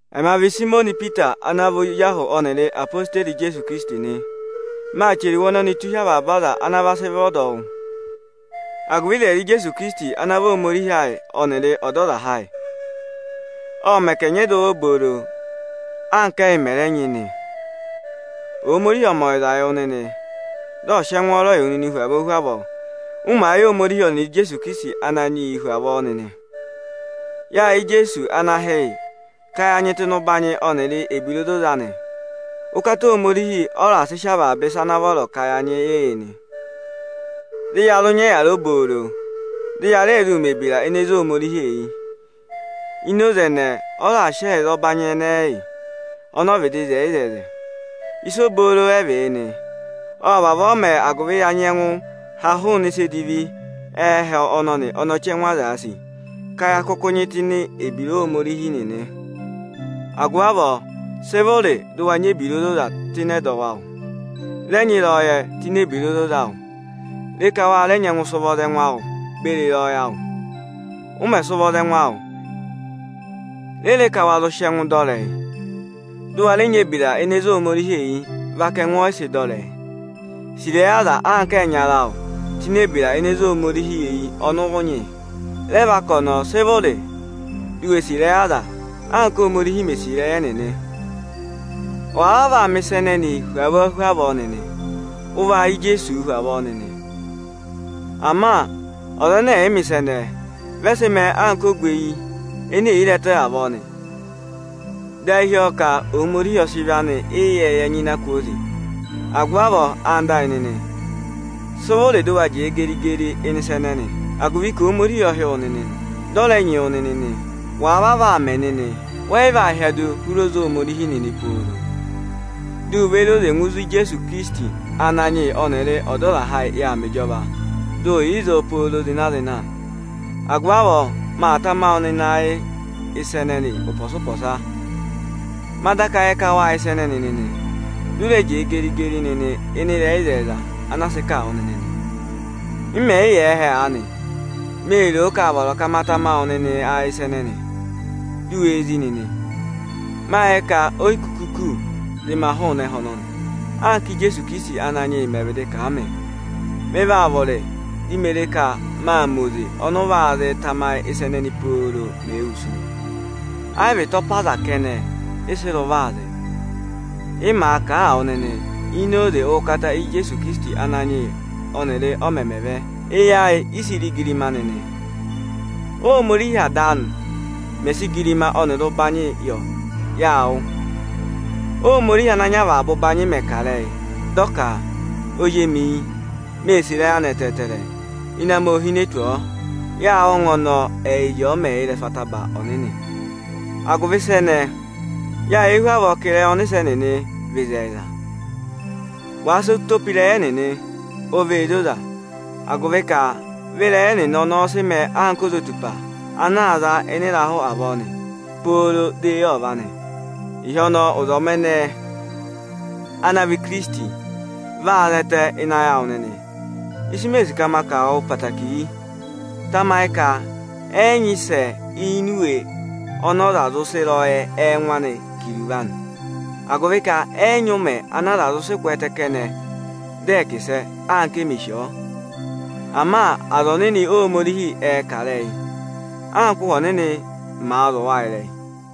Ẹmị a vị Ipita ana vị ozi ahụ ọnịrị odeyi Ijeesu Ikirisiti nị. Maa chẹrẹ iwe ọnọnịị tụ́ụ hi wu avaba aza ana sị vị ọdọwụ. Agụvị ịzẹyịza Ijeesu Ikirisiti ana vị Ohomorihi ayị ọnịrị Ọdọzaha ayị, ọ̀ mẹ ka ẹ̀ nyị ẹdọwụ obooro, anka ẹyị mẹ̀ rẹ nyị nị. Ohomorihi ọ̀ mẹ ọyịza wụ nịnị, dị ọ̀ sị ẹngwọọrọ yị wụ hu avọọ hu avọọ, ụ màa yẹ Ohomorihi ọnịrị Ijeesu Ikirisiti Ananyị yị hu avọọ nịnị. Yáa yẹ Ijeesu ana hị́ yị ka ya nyị tụ́ ịnị ụbanyị anị ọnịrị ebira ozoza anị. Ụkata Ohomorihi ọ raà sị avaba ịsa ana vọrọ ka ya nyị yị, dị ya zụ nyị ebira obooro, dị ya rẹ zụ mẹ̀ ebira ene ze Ohomorihi eyi. Ini oze ẹnẹẹ ọ raà sị ẹyịza ọbanyị ẹnẹẹ yị ọnị ọ vịdị zẹẹ yị ịzẹzẹ anị. Ịsa obooro ẹ vị yị nị. Ộ vavọọ mẹẹ, agụvị dị ya nyẹngụ há hụụnị ịsa edivi ẹhẹ ọnọnị ọnị ọchẹngụ azaā sì, ka ya kụkụ va nyị tụ́ ini ebira Ohomorihi nịnị. Agụvị avọọ, sị vụrị dụ wa nyị ebira ozoza tụ́ ịnị ẹdọwụ awụ nịnị. Rẹ nyị ịrẹyọyẹ tụ́ ini ebira ozoza awụ, re ka wa nyẹngụ sị ụvọ za ẹngụ awụ beri ịrẹyọyẹ awụ! Ụ mẹ̀ sị ụvọ za ẹngụ awụ, re ka wa nyẹngụ sị ẹngụ dọ ịrẹyị, dụ wa rẹ nyị ebira ene zé Ohomorihi eyi vaka ẹngụ ọyịsị dọ ịrẹyị! Sì ịrẹyị aza anka ẹyịnyara awụ tụ́ ini ebira ene zé Ohomorihi eyi ọnị ụ nyị! Rẹ vaka ọnọọ, sị vụrị di u we sì ịrẹyị aza anka Ohomorihi mè sì ịrẹyị ẹnịnị. Wàa vavọọ aa mẹ̀ ịsa ẹnẹnịị hu avọọ hu avọọ nịnị, ụ vaa yẹ Ijeesuu hu avọọ nịnị. Ama ọza ẹnẹ ẹ̀yị mẹ̀ ịsa ẹnẹẹ, vị ẹ sị mẹẹ anka ogweyi ene è yi re ẹtẹ avọọ nị, dị ayị hí ọ ka Ohomorihi ọ sị ịvị anị ịyẹẹyẹ nyịna kwooze. Agụvị avọọ, anda ayị nịnị, sị vụrị dụ wa jẹẹ geri-geri ịnị ịsa ẹnẹnị, agụvị ka Ohomorihi ộ hị́ wụ nịnị, dị ọ rẹ nyị wụ nịnị nị. Wàa vavọọ aa mẹ nịnị, wẹ́ yị vaa hyẹdụ hụrị oze Ohomorihi nịnị pooro. Ọsọnị ọ vaa mẹ ka we ré oze ngụ ịzị Ijeesu Ikirisiti Ananyị yị ọnịrị Ọdọzaha ayị yà aa mẹ ịjọva, dị ụ yà ịzọọ pooro zịna-zịna nị. Agụvị avọọ miī sì ka maa tama wụ nịnị ayị ịsa ẹnẹnị ụpọsa-ụpọsa nị, ma daka yẹ ka waa yẹ wa nịnị, dị ụ rẹ jẹẹ geri-geri nịnị ịnị ịrẹyị ịzẹyịza ana a sị kà wụ nịnị. M mẹ yị yà ẹhẹ aanị, mée ro ka aa vọrọ ka ma tama wụ nịnị ayị ịsa ẹnẹnị, du wee zí nịnị. Máa yẹ ka o yi kuku kù, dị ma hụụnị ẹhẹ ọnọnị, anka Ijeesu ikirisiti Ananyị yị mẹ̀ vịdị kà a mị. Mị vaa vụrị dị me ré ka máa mẹ oze ọnị ụ va zịị tamayị ịsa ẹnẹnị pooro, mèe wusu. Ẹ yị vị ịtọpa aza kẹnẹ ị sị rị ụvọ aa zị, ị maa kà a wụ nịnị ini oze ụkata Ijeesu Ikirisiti Ananyị yị ọnịrị ọ mẹmẹ vẹ. Ama yáa sị eyi ayị ré igirima anị. Óhomorihi Ada anị mẹ̀ sị igirima ọnịrị ụbanyị yọ, yáa wụ́, Óhomorihi ana nyị avaba ụbanyị mẹ̀ kà ịrẹyị, dị ọ ka: Ozi emi yị, mee sì ịrẹyị anị ẹtẹẹtẹrẹ, ịnẹ amị óo hine tù ọ. Yâ wụ́ ọngwẹ ọnọọ, ẹyịrị ọ mẹ̀ yà ịrẹsụ ataba ọnịnị. Agụvị ịsa ẹnẹẹ, yâ yẹ hu avọọ ka ịrẹyị ọnịsẹ nịnị vị ịzẹyịza. Wàa sị ụtọ pe ịrẹyị ẹnịnị o vee zoza; agụvị ka vị ịrẹyị ọnọọ sị mẹẹ ozotupa ana aa za ịnị ịrahụ avọọ nị, pooro dị eyi ọ va nị. Ịhị ọnọọ, ụzọmị ẹnẹnẹ (ana vị Ikirisiti) vaa zẹtẹ ịnị ayị awụ nịnị. Ịsị mee sì ka ma kà wụ nịnị ẹtẹẹtẹrẹ yị: Tamayị ka ẹ́ yị nyị ịsẹ ini Iwe Ohomorihi ọnị ọza zụ sị ịrẹyọyẹ ẹngụ anị kà iruvo anị; agụvị ka ẹ́ yị nyị ụmẹ ana aza zụ sị kwẹẹtẹ kẹnẹ, dị ẹ̀ẹ kà ịsẹ, anka e mè sì ọ. Ama aza ọnịnị Ohomorihi ệ kà ịrẹyị anka Ụhwẹ Ọnịnị màa zụ̀ wa ịrẹyị nị.